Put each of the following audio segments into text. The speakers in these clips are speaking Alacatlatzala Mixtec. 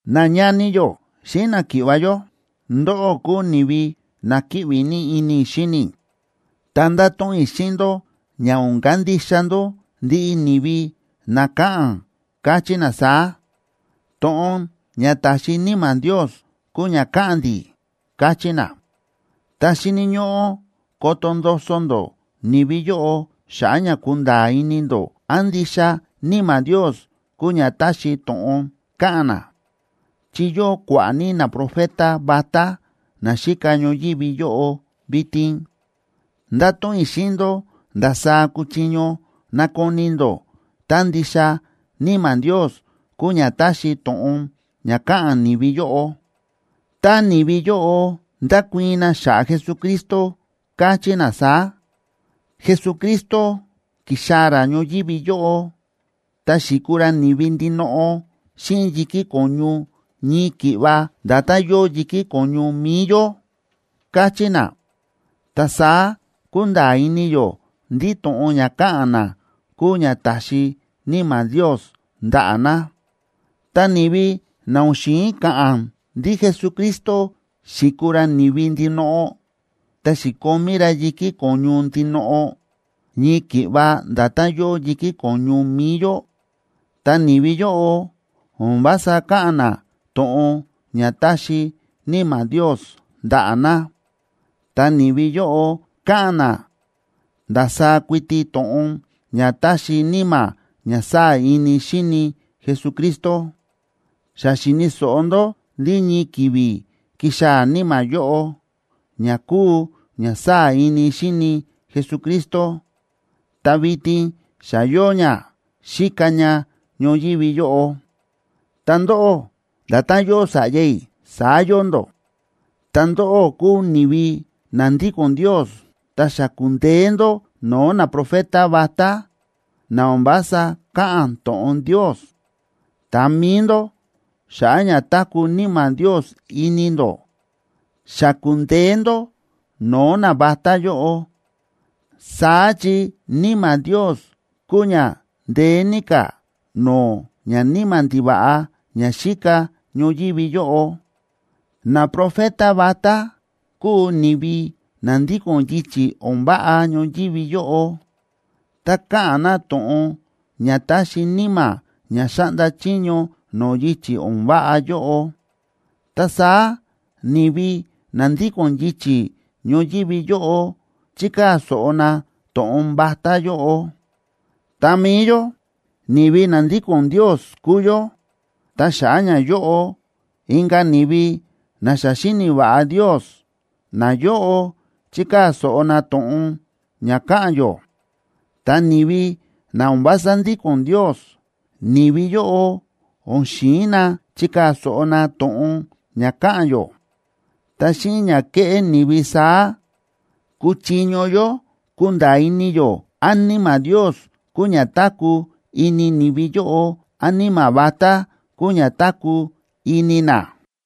Nañani yó xíꞌin náki̱ꞌva̱ yó, ndóꞌó kúu ni̱vi na kíꞌvi ní ini i̱ xíni i̱, ta ndáto̱ꞌon i̱ xíꞌin ndó ña o̱n kandixa ndó ndiꞌi ni̱vi na káꞌa̱n, káchí na saá: “To̱ꞌon ña ta̱xi Níma̱ Ndios kúu ña káꞌa̱n ndi̱”, káchí na. Ta xíni̱ ñóꞌó koto ndoso ndó ni̱vi yóꞌo xa̱ꞌa̱ ña kunda̱a̱ ini ndó án ndixa Níma̱ Ndios kúu ña ta̱xi to̱ꞌon káꞌa̱n na, chi yóo kua̱ꞌa̱ ní naprofeta vatá na xíka ñoyívi yóꞌo vitin. Ndáto̱ꞌon i̱ xíꞌin ndó ndasaá kúchiño nakoni ndó tá ndixa Níma̱ Ndios kúu ña ta̱xi to̱ꞌon ña káꞌa̱n ni̱vi yóꞌo. Tá ni̱vi yóꞌo ndákuii̱n na xa̱ꞌa̱ Jesucristo, káchí na saá: “Jesucristo, ki̱xaa̱ ra ñoyívi yóꞌo, ta xi̱kuu ra ni̱vi ndinoꞌo xíꞌin yi̱kí ko̱ñu ñii ki̱ꞌva nda̱tán yóo yi̱kí ko̱ñu mi̱i yó”, káchí na, ta saá kúnda̱a̱ ini yó ndí to̱ꞌon ña káꞌa̱n na kúu ña ta̱xi Níma̱ Ndios ndaꞌa̱ na. Ta ni̱vi na o̱n xi̱in ka̱ꞌa̱n ndí Jesucristo xi̱kuu ra ni̱vi ndinoꞌo, ta xi̱komí ra yi̱kí ko̱ñu ndinoꞌo, ñii ki̱ꞌva nda̱tán yóo yi̱kí ko̱ñu mi̱i yó, ta ni̱vi yóꞌo o̱n vása káꞌa̱n na to̱ꞌon ña ta̱xi Níma̱ Ndios ndaꞌa̱ na. Ta ni̱vi yóꞌo káꞌa̱n na ndasaá kuiti to̱ꞌon ña ta̱xi níma̱ ña sáa̱ ini xíni Jesucristo. Xa xi̱ni̱ so̱ꞌo ndó ndí ñii ki̱vi̱ kixaa̱ níma̱ yóꞌo, ña kúu ña sáa̱ ini xíni Jesucristo, ta vitin xa yóo ña, xíka ña ñoyívi yóꞌo. Ta ndóꞌó, nda̱tán yóo sa̱ꞌya i̱, saá yóo ndó, ta ndóꞌó kúu ni̱vi na ndíko̱n Ndios. Ta xa ku̱ndeé ndó no̱o̱ naprofeta vatá, na o̱n vása káꞌa̱n to̱ꞌon Ndios. Ta mi̱i ndó, xa̱ꞌa̱ ña táku̱ Níma̱ Ndios ini ndó, xa ku̱ndeé ndó no̱o̱ navatá yóꞌo, saá chi Níma̱ Ndios kúu ña ndeé ní ka̱ no̱o̱ ñaníma̱ ndiva̱ꞌa ña xíka ñoyívi yóꞌo. Naprofeta vatá kúu ni̱vi na ndíko̱n yichi̱ o̱n váꞌa ñoyívi yóꞌo, ta káꞌa̱n na to̱ꞌon ña ta̱xi níma̱ ña xáꞌnda chiño no̱o̱ yichi̱ o̱n váꞌa yóꞌo. Ta saá ni̱vi na ndíko̱n yichi̱ ñoyívi yóꞌo chíkaa̱ so̱ꞌo na to̱ꞌon vatá yóꞌo. Ta mi̱i yó, ni̱vi na ndíko̱n Ndios kúu yó, ta xa̱ꞌa̱ ñayóꞌo inka̱ ni̱vi na xa xíni̱ va̱ꞌa Ndios, nayóꞌo chíkaa̱ so̱ꞌo na to̱ꞌon ña káꞌa̱n yó. Ta ni̱vi na o̱n vása ndíko̱n Ndios, ni̱vi yóꞌo o̱n xi̱in na chikaa̱ so̱ꞌo na to̱ꞌon ña káꞌa̱n yó. Ta xíꞌin ña kéꞌé ni̱vi saá, kúchiño yó kunda̱a̱ ini yó án Níma̱ Ndios kúu ña táku̱ ini ni̱vi yóꞌo, án níma̱ vatá kúu ña táku̱ ini na.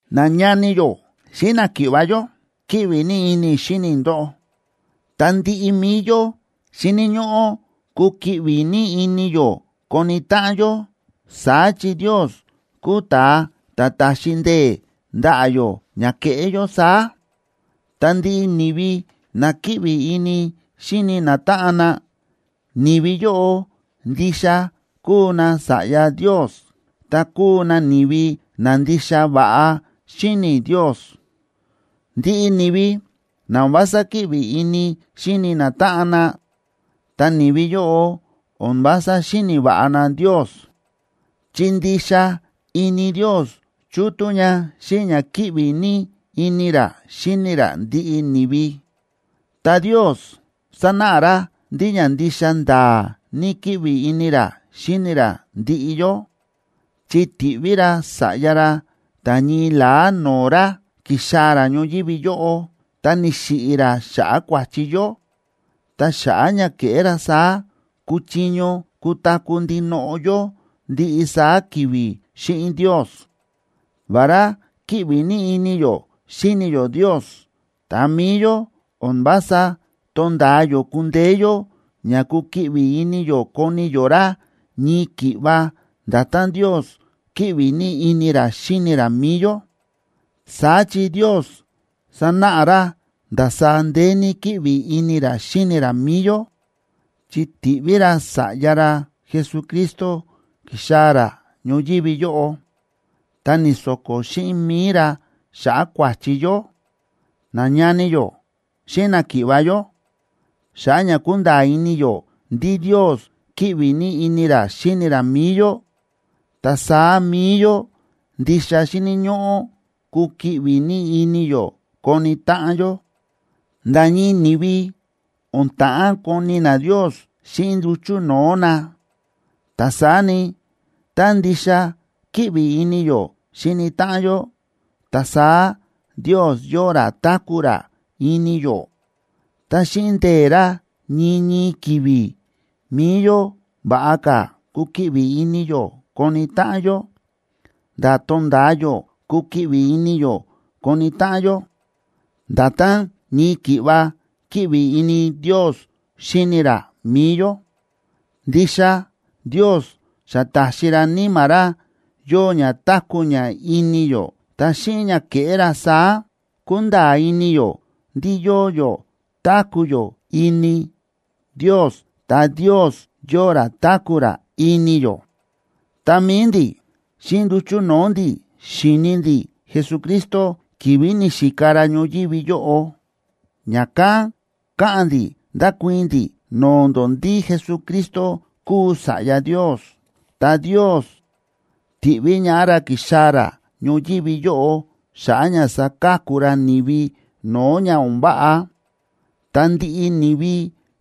Nañani yó xíꞌin náki̱ꞌva̱ yó, kíꞌvi ní ini i̱ xíni i̱ ndóꞌó, ta ndiꞌi mi̱i yó xíni̱ ñóꞌó kukiꞌvi ní ini yó koni táꞌan yó, saá chi Ndios kúu ta̱a ta̱ táxi ndee̱ ndaꞌa̱ yó ña keꞌé yó saá. Ta ndiꞌi ni̱vi na kíꞌvi ini xíni natáꞌan na, ni̱vi yóꞌo ndixa kúu nasa̱ꞌya Ndios, ta kúu na ni̱vi na ndixa va̱ꞌa xíni̱ Ndios. Ndiꞌi ni̱vi na o̱n vása kíꞌvi ini xíni natáꞌan na, ta ni̱vi yóꞌo o̱n vása xíni̱ va̱ꞌa na Ndios, chi ndixa ini Ndios chútú ña xíꞌin ña kíꞌvi ní ini ra xíni ra ndiꞌi ni̱vi. Ta Ndios sa̱náꞌa ra ndí ña ndixa nda̱a̱ ní kíꞌvi ini ra xíni ra ndiꞌi yó, chi ti̱ꞌví ra Sa̱ꞌya ra ta̱ ñii la̱á no̱o̱ ra, ki̱xaa̱ ra ñoyívi yóꞌo, ta ni̱xiꞌi̱ ra xa̱ꞌa̱ kua̱chi yó, ta xa̱ꞌa̱ ña ke̱ꞌé ra saá kuchiño kutaku̱ ndinoꞌo yó ndiꞌi saá ki̱vi̱ xíꞌin Ndios. Vará kíꞌvi ní ini yó xíni yó Ndios, ta mi̱i yó o̱n vása tónda̱a yó kundeé yó ña kukiꞌvi ini yó koni yó ra ñii ki̱ꞌva nda̱tán Ndios kíꞌvi ní ini ra xíni ra mi̱i yó. Saá chi Ndios sa̱náꞌa ra ndasaá ndeé ní kíꞌvi ini ra xíni ra mi̱i yó, chi ti̱ꞌví ra Sa̱ꞌya ra Jesucristo ki̱xaa̱ ra ñoyívi yóꞌo, ta ni̱so̱ko̱ xíꞌin mi̱i ra xa̱ꞌa̱ kua̱chi yó. Nañani yó xíꞌin náki̱ꞌva̱ yó, xa̱ꞌa̱ ña kúnda̱a̱ ini yó ndí Ndios kíꞌvi ní ini ra xíni ra mi̱i yó, ta saá mi̱i yó ndixa xíni̱ ñóꞌó kukiꞌvi ní ini yó koni táꞌan yó. Nda̱ ñii ni̱vi o̱n ta̱ꞌán koni na Ndios xíꞌin nduchu̱ no̱o̱ na, ta saá ni, tá ndixa kíꞌvi ini yó xíni táꞌan yó, ta saá Ndios yóo ra táku̱ ra ini yó, ta xíꞌin ndee̱ ra ñii ñii ki̱vi̱ mi̱i yó va̱ꞌa ka̱ kukiꞌvi ini yó koni táꞌan yó, nda̱ tonda̱a yó kukiꞌvi ini yó koni táꞌan yó, nda̱tán ñii ki̱ꞌva kíꞌvi ini Ndios xíni ra mi̱i yó. Ndixa Ndios xa ta̱xi ra Níma̱ ra yóo ña táku̱ ña ini yó. Ta xíꞌin ña ke̱ꞌé ra saá, kúnda̱a̱ ini yó ndí yóo yó táku̱ yó ini Ndios ta Ndios yóo ra táku̱ ra ini yó. Ta mi̱i ndi̱, xíꞌin nduchu̱ no̱o̱ ndi̱ xi̱ni ndi̱ Jesucristo ki̱vi̱ ni̱xika ra ñoyívi yóꞌo, ña̱kán káꞌa̱n ndi̱ ndákuii̱n ndi̱ no̱o̱ ndó ndí Jesucristo kúu Sa̱ꞌya Ndios, ta Ndios ti̱ꞌví ñaꞌá ra ki̱xaa̱ ra ñoyívi yóꞌo xa̱ꞌa̱ ña saka̱ku ra ni̱vi no̱o̱ ña o̱n váꞌa. Ta ndiꞌi ni̱vi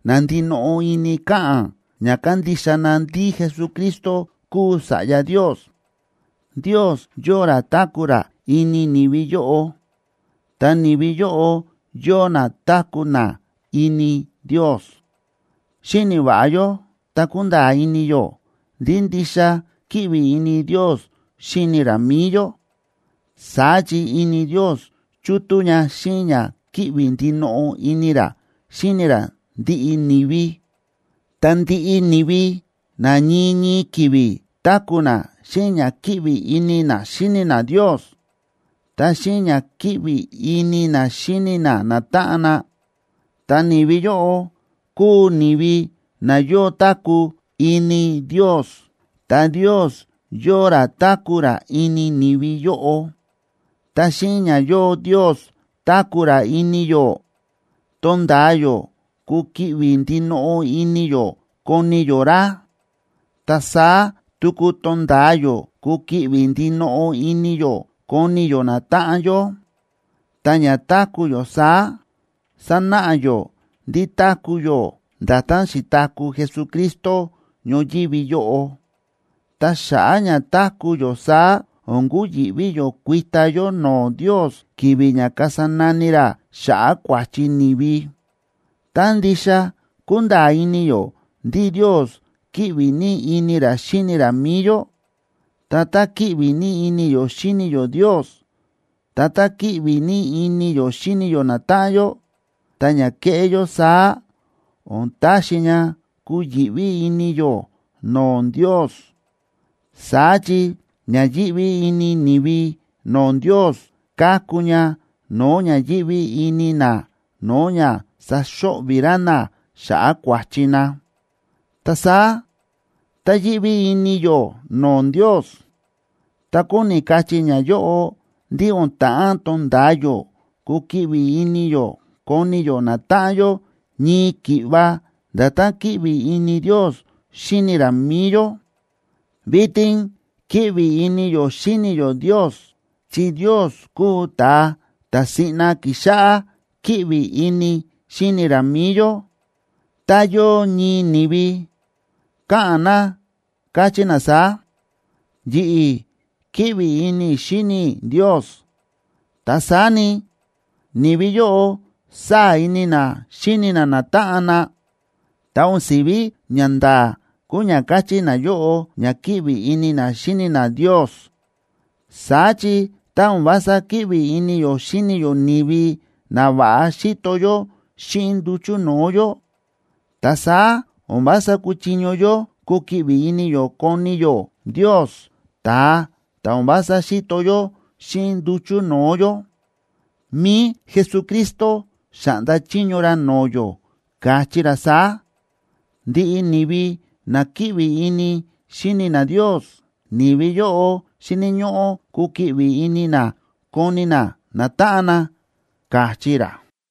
na ndinoꞌo ini káꞌa̱n ña kándixa na ndí Jesucristo kúu Sa̱ꞌya Ndios, Ndios yóo ra táku̱ ra ini ni̱vi yóꞌo, ta ni̱vi yóꞌo yóo na táku̱ na ini Ndios. Xíni̱ va̱ꞌa yó ta kúnda̱a̱ ini yó ndí ndixa kíꞌvi ini Ndios xíni ra mi̱i yó, saá chi ini Ndios chútú ña xíꞌin ña kíꞌvi ndinoꞌo ini ra xíni ra ndiꞌi ni̱vi. Ta ndiꞌi ni̱vi na ñii ñii ki̱vi̱ táku̱ na xíꞌin ña kíꞌvi ini na xíni na Ndios, ta xíꞌin ña kíꞌvi ini na xíni na natáꞌan na, ta ni̱vi yóꞌo, kúu ni̱vi na yóo táku̱ ini Ndios, ta Ndios yóo ra táku̱ ra ini ni̱vi yóꞌo. Ta xíꞌin ña yóo Ndios táku̱ ra ini yó, tonda̱a yó kukiꞌvi ndinoꞌo ini yó koni yó ra, ta saá tuku tonda̱a yó kukiꞌvi ndinoꞌo ini yó koni yó natáꞌan yó. Ta ña táku̱ yó saá, sánáꞌa yó ndí táku̱ yó nda̱tán xi̱taku̱ Jesucristo ñoyívi yóꞌo. Ta xa̱ꞌa̱ ña táku̱ yó saá o̱n kuyi̱ꞌví yó kuita yó no̱o̱ Ndios ki̱vi̱ ña kasa nani ra xa̱ꞌa̱ kua̱chi ni̱vi. Tá ndixa kúnda̱a̱ ini yó ndí Ndios kíꞌvi ní ini ra xíni ra mi̱i yó, ta tá kíꞌvi ní ini yó xíni yó Ndios, ta tá kíꞌvi ní ini yó xíni yó natáꞌan yó, ta ña kéꞌé yó saá o̱n taxi ña kuyi̱ꞌví ini yó no̱o̱ Ndios. Saá chi ña yíꞌví ini ni̱vi no̱o̱ Ndios, káku ña no̱o̱ ña yíꞌví ini na no̱o̱ ña saxo̱ꞌvi̱ ra na xa̱ꞌa̱ kua̱chi na. Ta saá tá yíꞌví ini yó no̱o̱ Ndios, ta kóni kachí ñayóꞌo ndí o̱n ta̱ꞌán tonda̱a yó kukiꞌvi ini yó koni yó natáꞌan yó ñii ki̱ꞌva nda̱tán kíꞌvi ini Ndios xíni ra mi̱i yó. Vitin kíꞌvi ini yó xíni yó Ndios chi Ndios kúu ta̱a ta̱ siꞌna ki̱xáꞌá kíꞌvi ini xíni ra mi̱i yó. Tá yóo ñii ni̱vi, káꞌa̱n na káchí na saá: “Yi̱ꞌi̱ kíꞌvi ini i̱ xíni i̱ Ndios”, ta saá ni, ni̱vi yóꞌo sáa̱ ini na xíni na natáꞌan na, ta o̱n si̱ví ñanda̱a̱ kúu ña káchí nayóꞌo ña kíꞌvi ini na xíni na Ndios. Saá chi tá o̱n vása kíꞌvi ini yó xíni yó ni̱vi na va̱ꞌa xíto yó xíꞌin nduchu̱ no̱o̱ yó, ta saá o̱n vása kúchiño yó kukiꞌvi ini yó koni yó Ndios, ta̱a ta̱ o̱n vása xíto yó xíꞌin nduchu̱ no̱o̱ yó. Mi̱i Jesucristo xa̱ꞌnda chiño ra no̱o̱ yó, káchí ra saá: “Ndiꞌi ni̱vi na kíꞌvi ini xíni na Ndios, ni̱vi yóꞌo xíni̱ ñóꞌó kukiꞌvi ini na koni na natáꞌan na”, káchí ra.